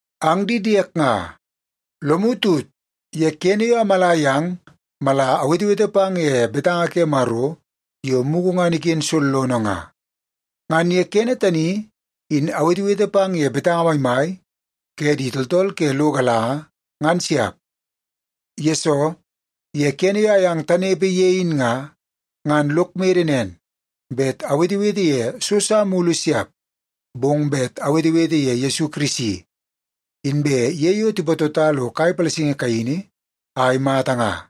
Ang di diek nga, lomu tut ye kene yo amala yang mala awetewete pang ye betanga ke Maro yo mugu ngan iken sollono nga. Ngan ye kene tani in awetewete pang ye betanga maimai ke di tooltool ke lo galanga, ngan siap. Yesoo, ye kene yo ayang tanepe ye in nga, ngan lok mede nen, bet awetewete ye so sa mulu siap, bong bet awetewete ye Yesu Kirisi, inbe ye yo tipatota lo kai palasingi kaini a imata nga.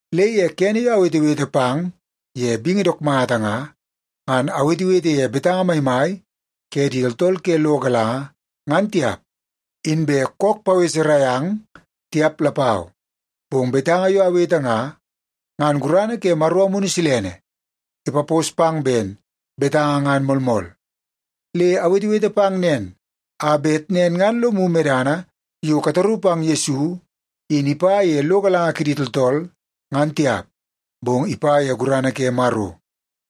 Le ye kene yo awetewete pang ye bingi dook mata nga, ngan awetewete ye betanga maimai ke di tooltool ke lo galanga ngan tiap, inbe kook paweserai ang tiap lapau. Bong betanga yo awete nga, ngan gurana ke Maro Amunu Silene ipapos pang ben betanga ngan moolmool. Le awetewete pang nen, a bet nen ngan lomu medana yo kataru pang Yesu in ipa ye lo galanga kidi tooltool, ngan tiap, bong ipa ye gurana ke Maro.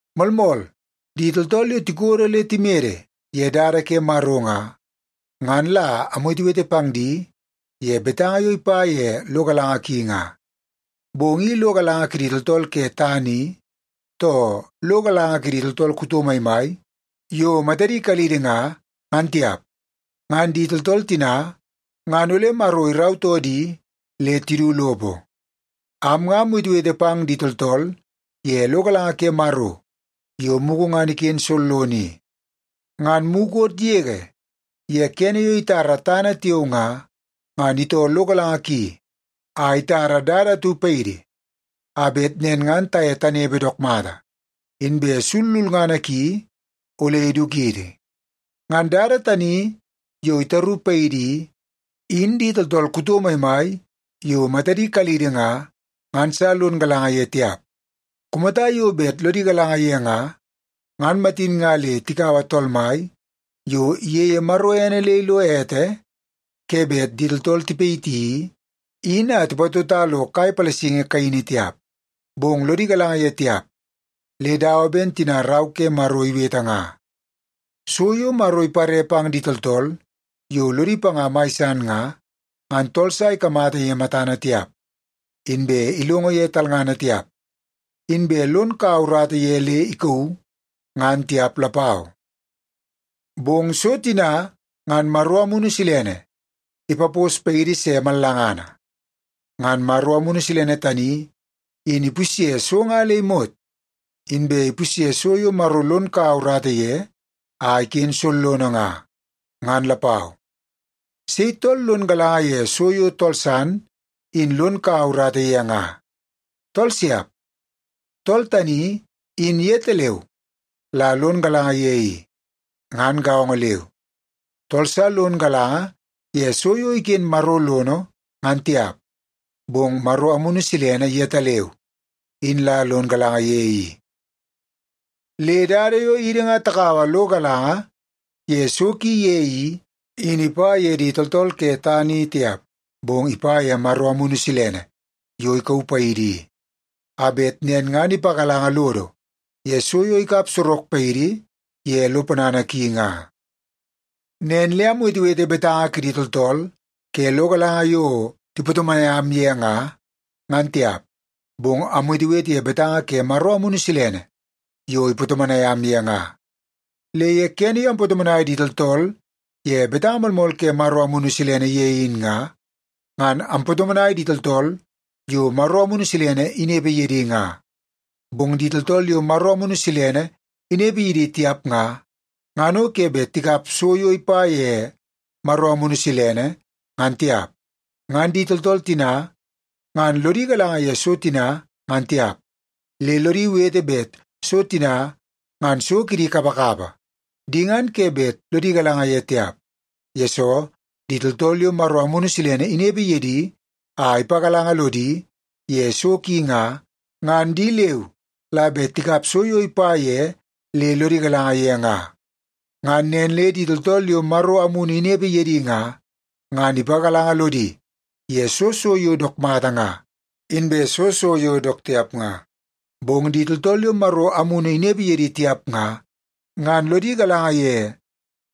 Moolmool, di tooltool yo tikodo le timede ye dada ke Maro nga, ngan la amwetewete pang di ye betanga yo ipa ye lo galanga ki nga. Bong i lo galanga kidi tooltool ke tana i, too lo galanga kidi tooltool kuto maimai yo matadi kalidi nga, ngan tiap. Ngan di tooltool tina ngan ole Maro irautoo di le tidu lopo. Am nga amwetewete pang di tooltool ye lo galanga ke Maro yo mugu ngan iken sollono i. Ngan mukot yege ye kene yo itara tana tiao nga, ngan itoo lo galanga ki a itara dada atu paidi a bet nen ngan taye tanepe dook mata, inbe sul lulngana ki ole idukidi. Ngan dada tani yo itaru paidi i, in di tooltool kuto maimai yo matadi kalidi nga, ngan sa lon galanga ye tiap. Kumata yo bet lodi galanga ye nga, ngan matin nga le tikaua Tool Mai yo iyeie Maro ene le ilo ete ke bet di tooltool tipayiti i, in a tipatota lo kai palasingi kaini tiap. Bong lodi galanga ye tiap le dawa ben tina Rau ke Maro iwete nga: “So yo Maro ipare pang di tooltool yo lodi panga mai san nga, ngan tool sa ikamata ye matana tiap, inbe ilongo ye talngana tiap, inbe lon kau urata ye le ikauu, ngan tiap lapau.” Bong so tina, ngan Maro Amunu Silene ipapos paidi se mallangana. Ngan Maro Amunu Silene tani in ipusye so nga le imot, inbe ipusye so yo Maro lon kaua urata ye a iken sollono nga, ngan lapau. Sei tool lon galanga ye so yo tool san in lon kaua urata ye nga? Tool siap! Tool tani in yetaleu la lon galanga ye i. Ngan gaongo leu, tool sa lon galanga ye so yo iken Maro lono ngan tiap, bong Maro Amunu Silene yetaleu in la lon galanga ye i. Le dada yo idi nga takaua lo galanga ye so ki ye i, in ipa ye di tooltool ke tana i tiap. Bong ipa ye Maro Amunu Silene yo ikauu paidi i, a bet nen ngan ipagalanga lodo ye so yo ikap sorok paidi ye lo ponana ki nga. Nen le amwetewete ye betanga kidi tooltool ke lo galanga yo tipatomonai am ye nga, ngan tiap, bong amwetewete ye betanga ke Maro Amunu Silene yo ipatomonai am ye nga. Le ye kene yo ampatomonai di tooltool ye betanga moolmool ke Maro Amunu Silene ye in nga, ngan ampatomonai di tooltool yo Maro Amunu Silene inepe ye di nga. Bong di tooltool yo Maro Amunu Silene inepe ye di tiap nga, ngan o ke bet tikap so yo ipa ye Maro Amunu Silene, ngan tiap. Ngan di tooltool tina ngan lodi galanga ye so tina ngan tiap, le lodi wete bet so tina ngan so kidi kapakapa. Di ngan ke bet lodi galanga ye tiap, yesoo di tooltool yo Maro Amunu Silene inepe ye di a ipagalanga lodi ye so ki nga, ngan di leu la bet tikap so yo ipa ye le lodi galanga ye nga. Ngan nen le di tooltool yo Maro Amunu inepe ye di nga, ngan ipagalanga lodi ye soo so yo dook mata nga, inbe soo so yo dook tiap nga. Bong di tooltool yo Maro Amunu inepe ye di tiap nga, ngan lodi galanga ye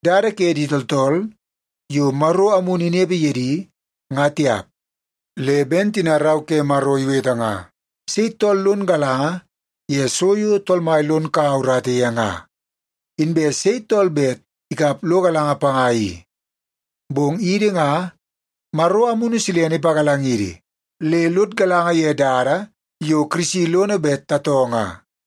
dada ke di tooltool yo Maro Amunu inepe ye di, nga tiap. Le ben tina Rau ke Maro iwete nga, “Sei tool lon galanga ye so yo Tool Mai lon kaua urata ye nga? Inbe sei tool bet ikap lo galanga panga i?” Bong idi nga, Maro Amunu Silene ipagalangidi le lod galanga ye dada yo Kirisi lono bet tatoo nga.